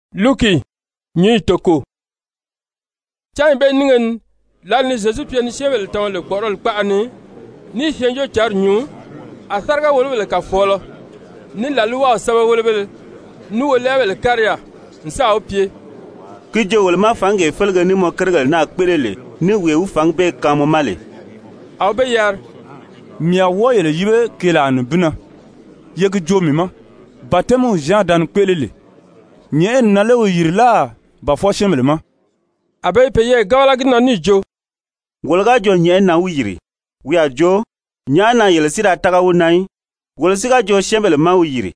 Sán Zyezu fǎngi yìri? Cányi bee nínge ni lǎli ni Zyezu pye ni syɛ́ɛnbèle tama lè kpɔ̀ʔɔrɔli kpaʔa ni ní i Syɛɛnjóocǎnri nyuu, a sáriga-wòlobèle kàfɔɔlɔ, ní làlwaw sɛ́bɛwelebéle, ní wolɛɛbèle kári yaà n sáà wi pye: «Ki joo wolo ma fǎngee félege ní mɔ kérigèle naa kpéʔele lè, ní wee wi fǎngi bee kaan mɔ ma lè?» A wi be yari: «Mii a wɔ́ɔ yele yíbe keelaa nibin na. Ye gi joo mii ma, batɛmiw Zyan da ni kpéʔele lè, nyɛ̀ʔɛni na lé wi yìri láà ba fwɔɔ syɛ́ɛnbèle ma?» A be i peyɛɛ gábala gi na níì jo: «Wolo ga jo nyɛ̀ʔɛni na wi yìri, wi a jo: ‹Nyàʔá na yele si da tága wi na í?› Wolo si ga jo syɛ́ɛnbèle má wi yìri,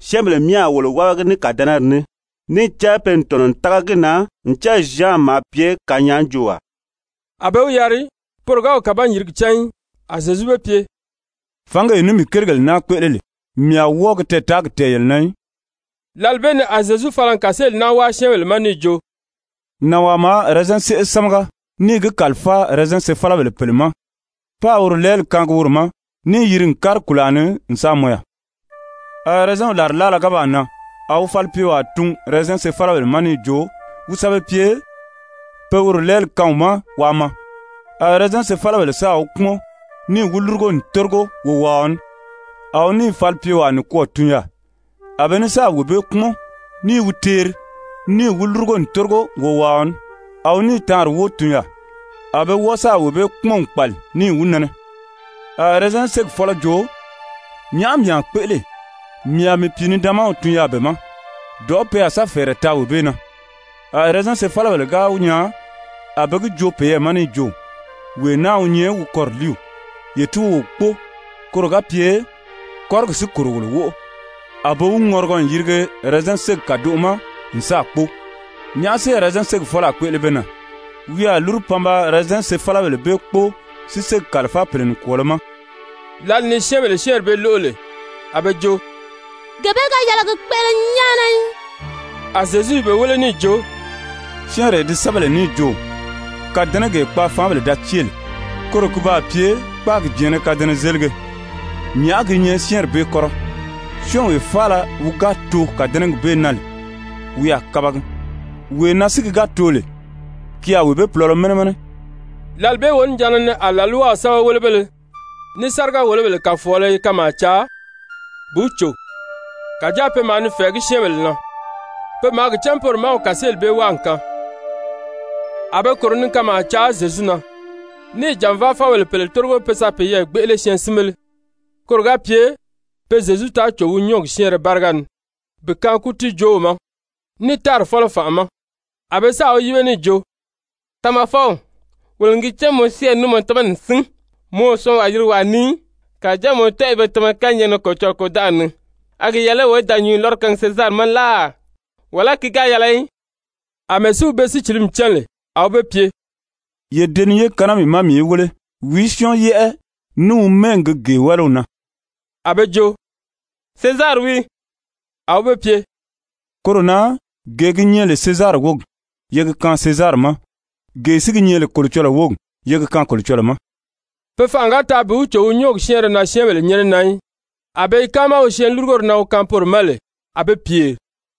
syɛ́ɛnbèle myɛ a wolo wábagi ní kàdɛnɛri ní, níì cán pe n tɔ̀nɔ n tága gi na ncan Zyan maa pye kanyaajoowaa A be wi yari, poro ga wi kàban-yìrigi cán í. A Zyezu be pye: «Fǎngee ní mii kérigèle naa kpéʔele lè, mii a wɔ́ɔ gi tɛɛtaagi tɛ̀ɛn yele na í.» Lǎli bee ni a Zyezu fala n kàseeli naa wáa syɛ́ɛnbèle ma níì jo: «Nànwaa maa ɛrɛzɛn séʔe sámaga níì gi kàlifáa ɛrɛzɛn sefalabèle pèle ma páā woro lɛɛli kaangi woro ma, níì yiri n kári kùlaa ni n sáà mɔn yaà. A ɛrɛzɛnw làrilaala ga baa nan, a wi falipyewaa tun ɛrɛzɛn sefalabèle ma níì jo wi sa be pye pe woro lɛɛli kaan wi ma waa maa. A ɛrɛzɛn sefalabèle sáà wi kpúmɔn níì wi lúrugo n tórigo wowaaɔ ní. A wi níì falipyewaa nikwɔɔ tun yaà. A be ní sáà wee bee kpúmɔn, ní i wi teeri, níì wi lúrugo n tórigo wowaaɔ ní. A wi níì taanri wóo tun yaà, a be wɔ́ɔ sáà wee bee kpúmɔn n kpàli níì wi nɛnɛ. A ɛrɛzɛn ségi fɔ́lɔ jo: ‹Nyàʔá mii a kpéʔele? Mii a mii pìinidaanmaw tun yaà be ma, dɔ̀ʔɔ́ pe a sa fɛ̀ɛrɛ taa wee bee na.› A ɛrɛzɛn sefalabèle ga wi nyaa, a be gi joo peyɛɛ ma níì jo: ‹Wee naa wi nyɛ wi kɔriliiw, ye tíi wo wi kpóo koro ga pye kɔ́rigi si kòro wolo wóʔo.› A be wi ŋɔrigɔ n yirige ɛrɛzɛn ségi kàdoʔo ma n sáà kpóo. Nyàʔá si ɛrɛzɛn ségi fɔ́lɔ a kpéʔele be na? Wi a lúru pan ba ɛrɛzɛn sefalabèle bee kpóo si ségi kàlifáa pèle nikwɔɔlɔ ma.» Lǎli ni syɛ́ɛnbèle syɛ́ɛnri bee lóʔo lè, a be jo: «Gee bee ga yɛlɛ gi kpéʔele nyáana í.» A Zyezu i be wéle níì jo: «Syɛ́ɛnree di sɛ́bɛ lè níì jo: ‹Kàdɛnɛgee kpaafaanbèle da cée lè, koro ki baa pye kpáagi jɛ̀ɛ́nnɛ kadɛnɛzelige,› nyàʔá gi nyɛ syɛ́ɛnri bee kɔ́rɔ? Syɔ́ɔnwee faala wi ga too kàdɛnɛgi bee na lè, wi a kabagi. Wee na si ki ga too lè, ki a wee bee pulɔlɔ mɛnɛ mɛnɛ.» Lǎli bee wonijanna ni a làlwaw sɛ́bɛwelebéle ní sáriga-wòlobèle kàfɔɔlɔ i kanmaa caa bi wi cò, kàjáa pe maa ni fɛ̀ɛgí syɛ́ɛnbèle na. Pe maa gi cán poro má wi kàseeli bee wáa n kaan. A be kòro ni kanmaa caa Zyezu na, níì jànvaafɔbèle pèle tórigo pe sa peyɛɛ gbéʔele syɛɛnsinbéle, koro ga pye pe Zyezu taa cò wi nyɔ́ɔgi syɛ́ɛnrɛ báriga ni bi kaan kútiijoow ma, ní tári fɔ́lɔ fànʔa ma. A be sáà wi yíbe níì jo: «Tamafɔw, wolo n gi cán mɔ syɛ́ɛnri ní mɔ tamani n sín, mɔ o syɔɔnwaa yirigi wàa ni í, kàjáa mɔ tɔ́ɔ i be tama kányɛɛgi na Kolocɔlɔɔ kôdanʔari ni. A gi yɛlɛ lé wolo í da nyǔnyi lɔ́rɔ kaangi Sezari ma láà, wàlá ki ga yɛlɛ í?» Amɛɛ si wi be sícilimi cán lè, a wi be pye: «Ye deniye kaan naa mii ma mii í wéle. Wìí syɔ́ɔn yɛ́ʔɛ ní wi mɛ́ɛgi gi gee wáliw na?» A be jo: «Sezari wii.» A wi be pye: «Koro na gee gi nyɛ lè Sezari wógi, ye gi kaan Sezari ma. Gee si gi nyɛ lè Kolocɔlɔɔ wógi, ye gi kaan Kolocɔlɔɔ ma.» Pe fanʔa ga taa bi wi cò wi nyɔ́ɔgi syɛ́ɛnrɛ na syɛ́ɛnbèle nyɛ́nɛ na í. A be i káama wi syɛɛnlurugori na wi kaan poro ma lè, a be pyèri.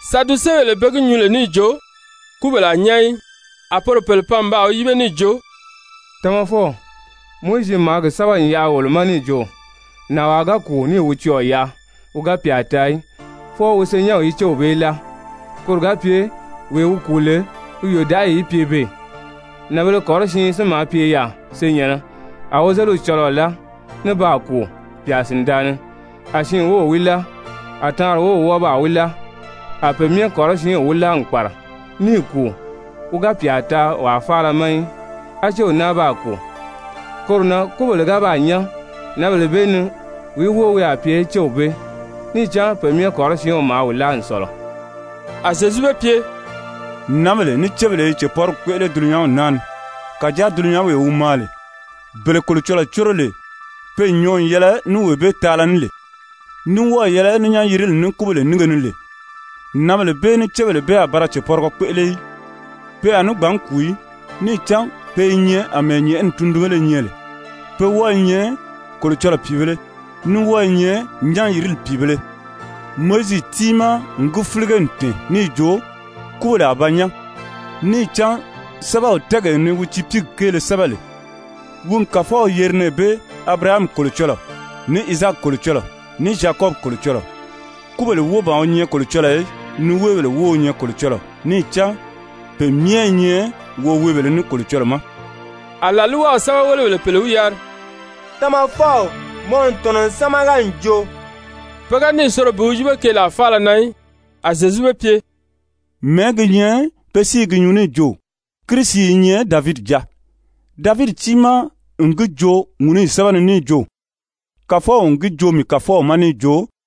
Sadusebèle pe gi nyuu lè níì jo kúbèle a nyán í, a poro pèle pan n baa wi yíbe níì jo: «Tamafɔw, Mowizi maa gi sɛ́bɛ n yaʔa wolo ma níì jo: Nànwaa ga kùu níì wi cɔɔ̀ yaʔa wi ga pyà taa í, fwɔɔ wi senyɛnw í céw bee láa, koro ga pye wee wi kùu lè wi yòdaʔayi í pye beè. Nànbēle kɔrɔsiin si maa pye yaà senyɛ̀nnɛ. A wozeliw cɔlɔɔ láa ní baa kùu, pyà sìndaa ni. A siin wów wi láa, a taanri wów wɔ́ɔ baa wi láa. A pe myɛ kɔrɔsiinw wi láa n kpàra níì kùu, wi ga pyà taa pe wàa faala ma í. A céw náa baa kùu. Koro na kúbèle ga baa nyán, nǎnbèle bee ni wìí wóo wi a pye céw bee? Níì cán pe myɛ kɔrɔsiinw maa wi láa n sɔ̀lɔ.» A Zyezu be pye: «Nǎnbèle ní cébèle i cèpɔrigi kpéʔele dulunyanw naa ni. Kàjáa dulunyanwee wi maa lè, bele Kolocɔlɔɔ córo lè pe n nyɔɔ n yɛlɛ ní wee bee taala ní lè, ní wɔ́ɔ̀ yɛlɛ ní nyán-yirili ní kúbèle nínge ni lè, nǎnbèle bee ní cébèle bee a ba ra cèpɔrigɔ kpéʔele í. Pe a ní gbǎn kùu í, níì cán pe i nyɛ àmɛɛ nyɛ̀ʔɛni tundunbéle nyɛ lè, pe wɔ́ɔ i nyɛ Kolocɔlɔɔ pìibēle, ní wɔ́ɔ i nyɛ nyán-yirili pìibēle. Mowizi tiimaa n gi fílige n tɛ̀ɛn níì jo kúbèle a ba nyán, níì cán sɛ́bɛw tɛ́ɛgee ni wi tiipiigi kéele sɛ́bɛ lè, wi n Kàfɔw yeri nɛɛ bee ‹Abirahami Kolocɔlɔɔ, ní Izaaki Kolocɔlɔɔ, ní Zyakɔbi Kolocɔlɔɔ.› Kúbèle wóo ban wi nyɛ Kolocɔlɔɔ í, niweebèle wóo wi nyɛ Kolocɔlɔɔ, níì cán pe myɛ i nyɛ woweebèlē ní Kolocɔlɔɔ ma.» A làlwaw sɛ́bɛwelebèle pèle wi yari: «Tamafɔw, mɔ n tɔ̀nɔ n sámaga n joo.» Pe ga níì soro bi wi yíbe keelaa faala na í. A Zyezu be pye: «Mɛ̀ɛ́ gi nyɛ be si i gi nyuu níì jo: Kirisi i nyɛ Davidi jáa? Davidi tiimaa n gi joo Ŋúnuyi sɛ́bɛ ni níì jo: Kàfɔw n gi joo mii Kàfɔw ma níì jo: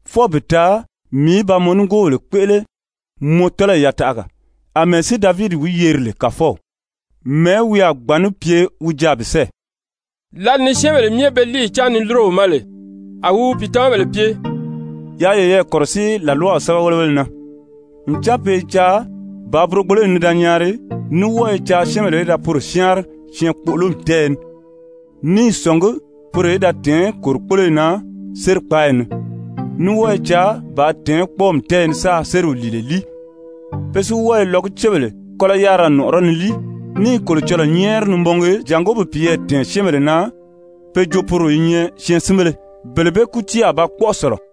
fwɔɔ bi taa mii í ba mɔ nigoobèle kpéʔele mɔ tɔ́lɔyi yataʔaga.› Amɛɛ si Davidi wi yeri lè Kàfɔw, mɛ̀ɛ́ wi a gbǎn ní pye wi jaà bi sɛ́ɛ?» Lǎli ni syɛ́ɛnbèle myɛ be líiyi cáan ni lúro wi ma lè, a wi wi pìitamabèle pye: «Yaa yeyɛɛ kɔ̀rɔsíi làlwaw sɛ́bɛwelebéle na. Ncan pe i caa bàā burogboloyi nii da nyaari, ní wɔ́ɔ i caa syɛ́ɛnbèle í da poro syáanri syɛɛnkpoʔolomi tɛ́ɛyɛ ni, ní i sɔ̀ngí poro í da tɛ̀ɛ́n kòrikpoloyi na sérikpaayi ni, ní wɔ́ɔ i caa bàā tɛ̀ɛ́n kpɔ́ɔmi tɛ́ɛyɛ ni sáā sériw lìile líi. Pe si wɔ́ɔ i lɔgucebèle kɔ́lɔ yárira nɔ̀ʔɔrɔ ni líi, ní i Kolocɔlɔɔ nyɛ́ɛri ni mɔngi jàngó bi peyɛɛ dɛ̀ɛn syɛ́ɛnbèle na pe jo poro i nyɛ syɛɛnsinbéle. Bele bee kútii a ba kpɔ́ʔɔ sɔ̀lɔ.»